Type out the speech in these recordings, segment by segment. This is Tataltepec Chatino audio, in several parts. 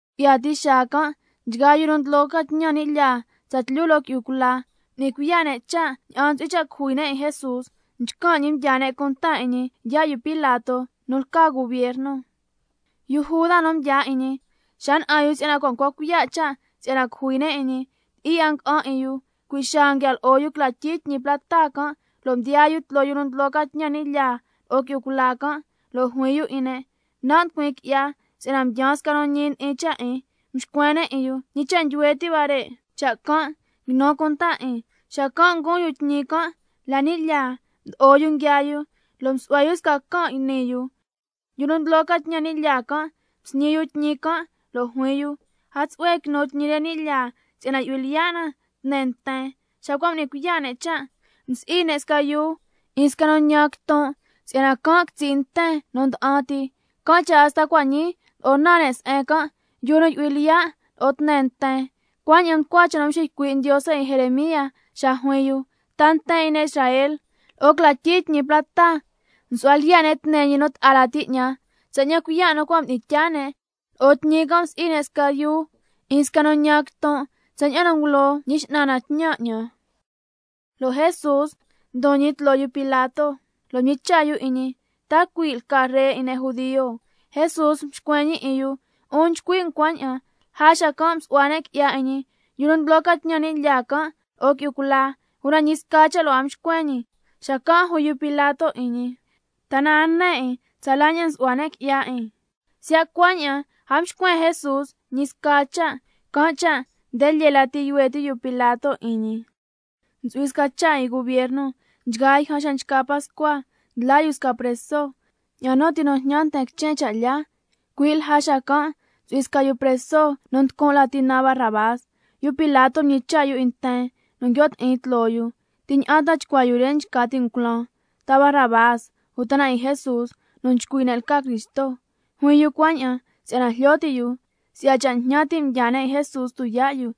Ngu'ya ti xaa can', nchgaa yu nu ndlo ca tñan ni' lyaa tsatlyu lo'o qui'yu cula, m'ni cuiya' ne' cha' ña'an ntsu'hui cha' cujui ne' 'in Jesús. Nchcan' ñi mdyaa ne' cunta 'in ñi yaa' yu Pilato, nu lca gubierno. Yu Juda nu mdyaa 'in ñi, xa na'an yu si'yana cua' ncua cuiya' cha' si'yana caja ñi, ti'i 'a nga'an 'in yu. Cui' xaa nguia lo'o yu cla tyii tñi plata can', lo' mdiyaa yu tloo yu nu ndlo ca tñan ni' lyaa lo'o qui'yu cula can', lo' juin yu 'in ne': Nan' nducuin qui'ya si'yana mdyaan sca nu ñi ndi'in cha' 'in. Mxcuen ne' 'in yu: ¿Ñi cha' ndyuhue ti' huare' cha' can'? Quinu cunta 'in. Xacan' nguun yu tñi can' la ni' lyaa, mdo'o yu nguiaa yu lo' msu'hua yu sca can' yni yu. Nchgaa yu nu ndlo ca tñan ni' lyaa can', msñi yu tñi can' lo' juin yu: A tsu'hue quinu tñi re ni' lyaa, si'yana cui' na yu'hui lyiya' na tne nten. Xa cua' m'ni cuiya' ne' cha', msi'i ne' sca yuu 'in sca nu ntñan quiton', si'yana can' quitsi' nten nu nda'an ti. Can' cha' hasta cua' ñii ndlo'o naan ne' se'en can': Yuu nu yu'hui lyiya' lo'o tne nten. Cuaña'an mducua cha' nu mxiycui' Ndiose 'in Jeremía xa juin yu: —Ta nten 'in ne' Israel, lo'o cla tyii tñi plata msu'hua lyiya' ne' tne ñi nu ta'a lati 'ñan, tsaña'an cuiya' nu cua' mdi'in tyaa ne'. Lo'o tñi can' msi'i ne' sca yuu 'in sca nu ntñan quiton', tsaña'an nu ngulo Ñi X'nan na tñan 'ñan—. Lo' Jesús ndon ñi tloo yu Pilato, lo' mñicha' yu 'in ñi: ¿Ta cui' lca Ree 'in ne' judio? Jesús mxcuen ñi 'in yu: 'Un nchcui' um cuaña'an. Lja xacan' msu'hua ne' qui'ya 'in ñi, yu nu ndlo ca tñan ni' lyaa can' lo'o qui'yu cula, una ñi sca cha' lo' a mxcuen ñi. Xacan' juin yu Pilato 'in ñi: ¿Ta na a ne 'in, tsala ña'an nsu'hua ne' qui'ya 'in? Siya' cuaña'an, a mxcuen Jesús ñi sca cha', can' cha' nde lyee lati yuhue ti' yu Pilato 'in ñi. Ndeña'an ntsu'hui sca cha' 'in gubierno nchgaa yjan xa nchca Pascua, ndlaa yu sca preso, ña'an nu ti nu jñan nten quichen cha' lyaa. Cui' lja xacan' ntsu'hui sca yu preso nu nducun' lati naan Barrabás. Yu Pilato mñicha' yu 'in nten nu nguio' ti'in tloo yu: ¿Ti ña'an chcuaa yu re nchca ti' um culaan, ta Barrabás, uta 'in Jesús nu nchcui' ne' lca Cristo? Juin yu cuaña'an si'yana jlyo ti' yu si'ya cha' njñan ti' mdyaa ne' 'in Jesús tuyaa' yu.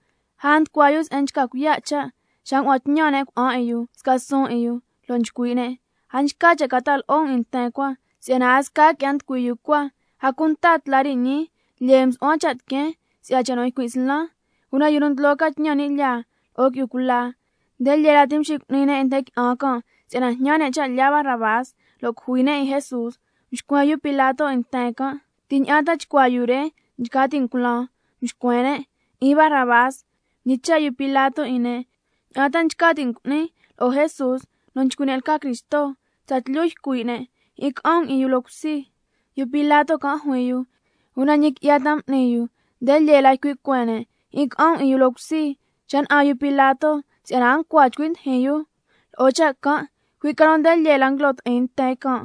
Lja nducua yu se'en nchca cuiya' cha', xa ngua'an tñan ne' cuna'an 'in yu sca suun 'in yu, lo' nchcui' ne': A nchca cha' ca ta'a lo'o um nten cua, si'yana a sca qui'ya nducui yu cua, a cunta tla re ñii lyee msu'huan cha' tiqueen si'ya cha' nu ycuin' slan. Una yu nu ndlo ca tñan ni' lyaa tsatlyu lo'o qui'yu cula, nde lyee la mxicu'ni ne' 'in nten qui'an can' si'yana jñan ne' cha' lyaa Barrabás, lo' cujui ne' 'in Jesús. Mxcuen yu Pilato 'in nten can': ¿Ti ña'an ta chcuaa yu re nchca ti' um culaan? Mxcuen ne': 'In Barrabás. Mñicha' yu Pilato 'in ne': ¿Ña'an ta nchca ti' um cu'nin lo'o Jesús, nu nchcui' ne' lca Cristo? Tsatlyu ycui' ne': ¡Jyi'in ca'an um 'in yu loo cusi! Yu Pilato can' juin yu: ¿Una ñi qui'ya ta m'ni yu? Nde lyee la ycui' cueen ne': ¡Jyi'in ca'an um 'in yu loo cusi! Xa na'an yu Pilato si'yana a ncua 'a chcui ndijin yu lo'o cha' can', cui' ca nu nde lyee la nguilo ti'in nten can',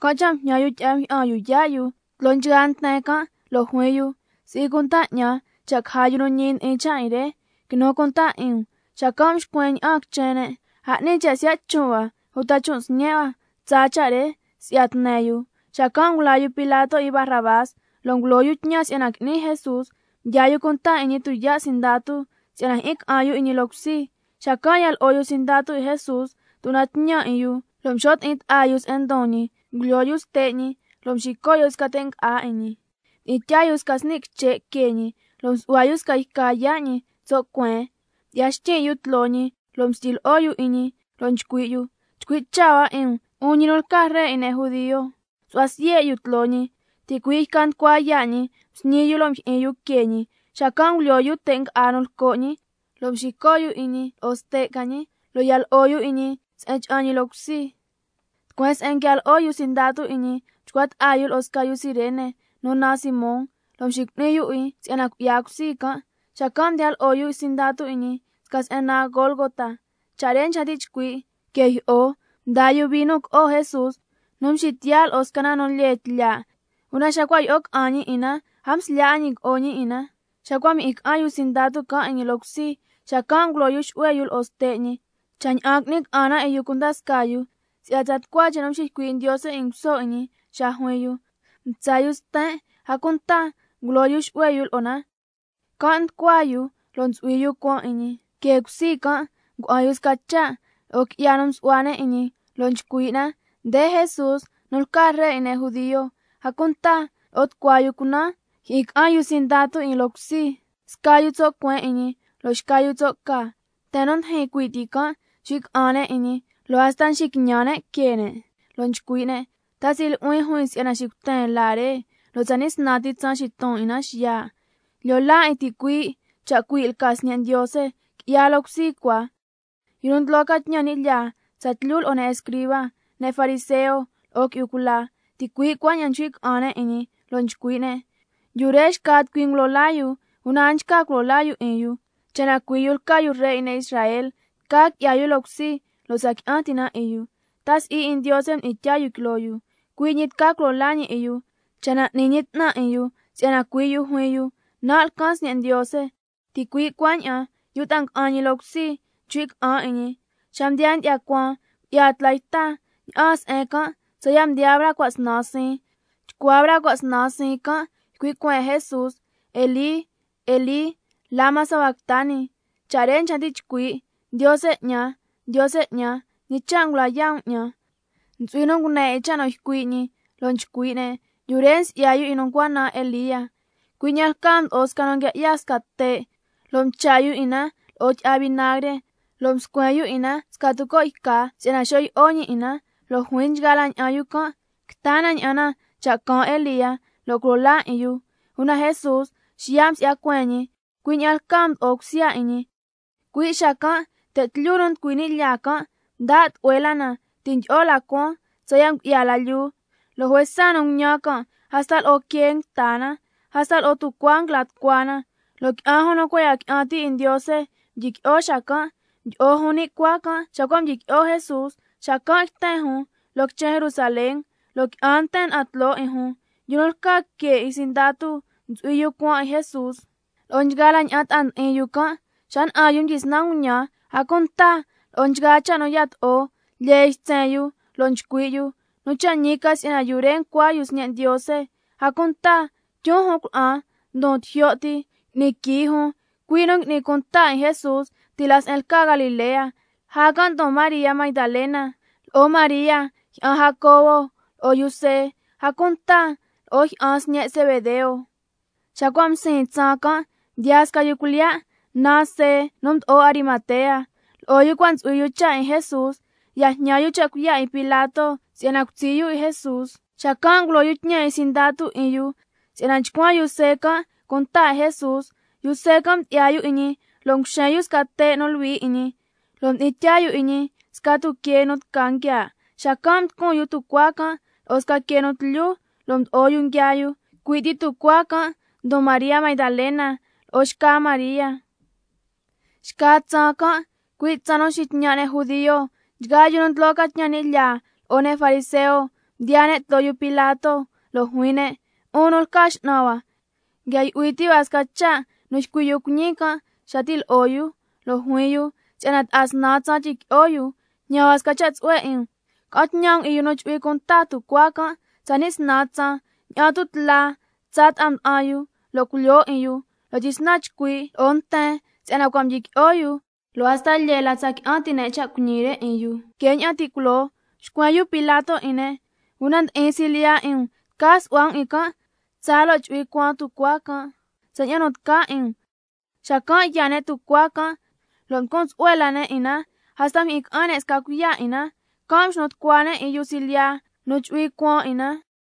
can' cha' mjñan yu tyi'a mjyi'an yu yaa' yu tloo nchgaa nten can', lo' juin yu: Si'i cunta 'ñan cha' caja yu nu ñi ndi'in cha' 'in re, quinu cunta 'in um. Xacan' mxcuen ña'aan quichen ne': A 'ni cha' siya' chon' hua, uta chon' sñe' hua tsaa cha' re si'ya tne yu. Xacan' ngulaa yu Pilato 'in Barrabás, lo' ngulo yu tñan si'yana qui'ni Jesús. Mdyaa yu cunta 'in ñi tuyaa' sindatu si'yana jyi'in ca'an yu 'in ñi loo cusi. Xacan' ya lo'o yu sindatu 'in Jesús tuna'an tñan 'in yu, lo' mxo' ti'in ta'a yu se'en ndon ñi, ngulyoo yu ste' ñi lo' mxico' yu sca te' nga'á 'in ñi. Xacan' mdi'in tyaa yu sca sni' quiche' que ñi, lo' msu'hua yu sca yca yaa' ñi tso' cueen, mdyi'ya xtyin' yu tloo ñi lo' mstyi lyi'o yu 'in ñi lo' nchcui' yu: ¡Nchcui' cha' hua 'in um, 'un ñi nu lca Ree 'in ne' judio! Xacan' msu'hua siye' yu tloo ñi, ticui' yca nducua yaa' ñi msñi yu lo' mjyi'in yu que ñi. Ngulyoo yu te' nga'á nu lco' ñi, lo' mxico' yu 'in ñi lo'o ste' ca ñi, lo' ya lo'o yu 'in ñi se'en cha'an ñi loo cusi. Tucueen se'en nguia lo'o yu sindatu 'in Jesús, mchcua ta'a yu lo'o sca yu Cirene nu naan Simón, lo' mxicu'ni yu 'in si'yana cui'ya cusi can'. Xacan' mdiya lo'o yu sindatu 'in ñi sca se'en naan Gólgota, cha' re nchca ti' chcui', que jyi'o. Mdaa yu vino co'o Jesús nu mxitiya' lo'o sca na nu lyee tlyaa', una xa cua' yi'o ca'an ñi 'in na, a mslyaa 'a ñi co'o ñi 'in na. Xa cua' mjyi'in ca'an yu sindatu can' 'in ñi loo cusi, xacan' ngulo yu xu'hue yu lo'o ste' ñi, cha' ña'an qui'ni ca'an na 'in yu cunda scaa yu, si'yana tsa tucua cha' nu mxiycui' Ndiose 'in nguso 'in ñi cua' s'ni, xa juin yu: —Mtsa yu sten', a cunta ngulo yu xu'hue yu lo'o na—. Can' nducua yu lo' ntsu'hui yu cuan 'in ñi. Que cusi can' ngua'an yu sca cha' lo'o qui'ya nu msu'hua ne' 'in ñi, lo' nchcui' na: Nde Jesús nu lca Ree 'in ne' judio. A cunta lo'o tucua yu cunan mjyi'in ca'an yu sindatu 'in loo cusi, sca yu tso' cueen 'in ñi, lo' xca yu tso' ca. Nten nu ndijin cui' ti can' nchcui' ca'an ne' 'in ñi, lo' hasta nxiquiñan ne' que ne', lo' nchcui' ne': ¿Ta si'i nu'huin juin si'yana xicuten laa nducua re, lo' tsani' snan ti tsaan xiton 'in na xiya'? ¡Lyo laa 'in ticuii'! Cha' cui' lca Sñe' Ndiose, qui'ya loo cusi cua. Yu nu ndlo ca tñan ni' lyaa tsatlyu lo'o ne' escriba, ne' fariseo lo'o qui'yu cula, ticui' cuaña'an nchcui' ca'an ne' 'in ñi lo' nchcui' ne': Yu re xca tucui ngulo laa yu, una a nchca culo laa yu 'in yu. Cha' na cui' yu lca yu Ree 'in ne' Israel, tca qui'ya yu loo cusi, lo' tsa qui'an ti' na 'in yu. ¿—Ta si'i 'in Ndiose mdi'in tyaa yu quiloo yu? Cui' ñi tca culo laa ñi 'in yu cha' na n'ni ñi 'tnan 'in yu—, si'yana cui' yu juin yu: Nan' lcan Sñe' Ndiose. Ticui' cuaña'an yu nu ta'a nga'an ñi loo cusi nchcui' ca'an 'in ñi. Xa mdiyaa ndyi'ya cuaan, ngu'ya tla yta ña'aan se'en can' tsaya' mdiyaa braa cua' snan siin. Chcua braa cua' snan siin can' ycui' cueen Jesús: —Elí, Elí, ¿lama sabactani—? Cha' re nchca ti' chcui': —Ndiose 'ñan, Ndiose 'ñan, ¿ñi cha' ta ngula yaa' um 'ñan—? Ntsu'hui nu ngune 'in cha' nu ycui' ñi, lo' nchcui' ne': Yu re nsi'ya yu 'in nu ncua naan Elía. Cui' ña'an lcaa mdo'o sca yu nu nguia 'ya sca te', lo' mcha' yu 'in na lo'o tyi'a vinagre, lo' mscuen yu 'in na sca tuco' yca si'yana xo' yi'o ñi 'in na. Lo' juin nchgaa la ña'an yu can': Quita na ña'an na cha' caan Elía, lo' culo laa 'in yu. Una Jesús xiya' msi'ya cueen ñi, cui' ña'an lcaa mdo'o cusya 'in ñi. Cui' xacan' te' tlyu nu nducui ni' lyaa can', mda' tlu'hue la na, ti' ndyi'o la cuaan tsaya' ngu'ya la lyuu, lo' juesa nu nguñan can' hasta lo'o quee nguita na. Hasta lo'o tucuaa nguila tucua na, lo' qui'an jun nu cua' ya qui'an ti' 'in Ndiose mdyiqui'o xacan', mdyi'o jun ni' cuaa can' xa cua' mdyiqui'o Jesús, xacan' yten jun loo quichen Jerusalén, lo' qui'an nten na'an tloo 'in jun. Yu nu lca que 'in sindatu ntsu'hui yu cuan 'in Jesús lo'o nchgaa la ña'an ta'a ndi'in yu can', xa na'an yu mdyisnan nguñan, a cunta lo'o nchgaa cha' nu yato'o, lyee ytsen yu, lo' nchcui' yu: Nu cha' ñi ca si'yana yu re ncua yu Sñe' Ndiose. A cunta tyun jun cuna'an ndon tijyo' ti, ngui'ni quii jun, cui' nu ngui'ni cunta 'in Jesús ti' la se'en lca Galilea, lja can' ndon María Magdalena, lo'o María jyi'an Jacobo lo'o yu See, a cunta lo'o jyi'an sñe' Zebedeo. Xa cua' msiin tsaan can' mdiyaa sca yu cuilyiya' naan See nu mdo'o Arimatea, lo'o yu cua' ntsu'hui yu cha' 'in Jesús. Ya jñan yu cha' cuiya' 'in Pilato si'yana cutsi' yu 'in Jesús. Xacan' ngulo yu tñan 'in sindatu 'in yu si'yana chcuan yu See can' cunta 'in Jesús. Yu See can' mdyi'ya yu 'in ñi lo' nguxen yu sca te' nu luhui 'in ñi, lo' mdi'in tyaa yu 'in ñi sca ni' tuquee nu tca nguiaa', xacan' mducun yu tucuaa can' lo'o sca quee nu tlyu, lo' mdo'o yu nguiaa yu. Cui' ti tucuaa can' ndon María Magdalena lo'o xca María. Xca tsaan can', cui' tsaan nu nxitñan' ne' judio, nchgaa yu nu ndlo ca tñan ni' lyaa, lo'o ne' fariseo mdiyaa ne' tloo yu Pilato, lo' juin ne': 'Un nu lca x'nan hua, nguia yu'hui ti' hua sca cha' nu ycui' yu cuiñi can' xa ti' lo'o yu, lo' juin yu si'yana ta'a snan tsaan tyiqui'o yu. Can' cha' cua' ñii jñan hua sca cha' tsu'hue 'in um, ca'an tñan um 'in yu nu chu'hui cuan tucuaa can' tsani' snan tsaan, ña'an tu' tla tsaa ta'a mda'an yu lo' culyoo 'in yu, lo' tyisnan chcui' lo'o nten si'yana cua' mdyiqui'o yu, lo' hasta lyee la tsa qui'an ti' ne' cha' cuiñi re 'in yu que ña'an ti' culoo. Mxcuen yu Pilato 'in ne': Una ndi'in silyiya 'in um, tca su'hua um 'in can' tsaa lo' chu'hui cuan tucuaa can', tsaña'an nu tca 'in um. Xacan' yaa ne' tucuaa can' lo' mducun tsu'hue la ne' 'in na, hasta mjyi'in ca'an ne' sca cuiya' 'in na, can' mxnu tucua ne' 'in yu nu chu'hui cuan 'in na.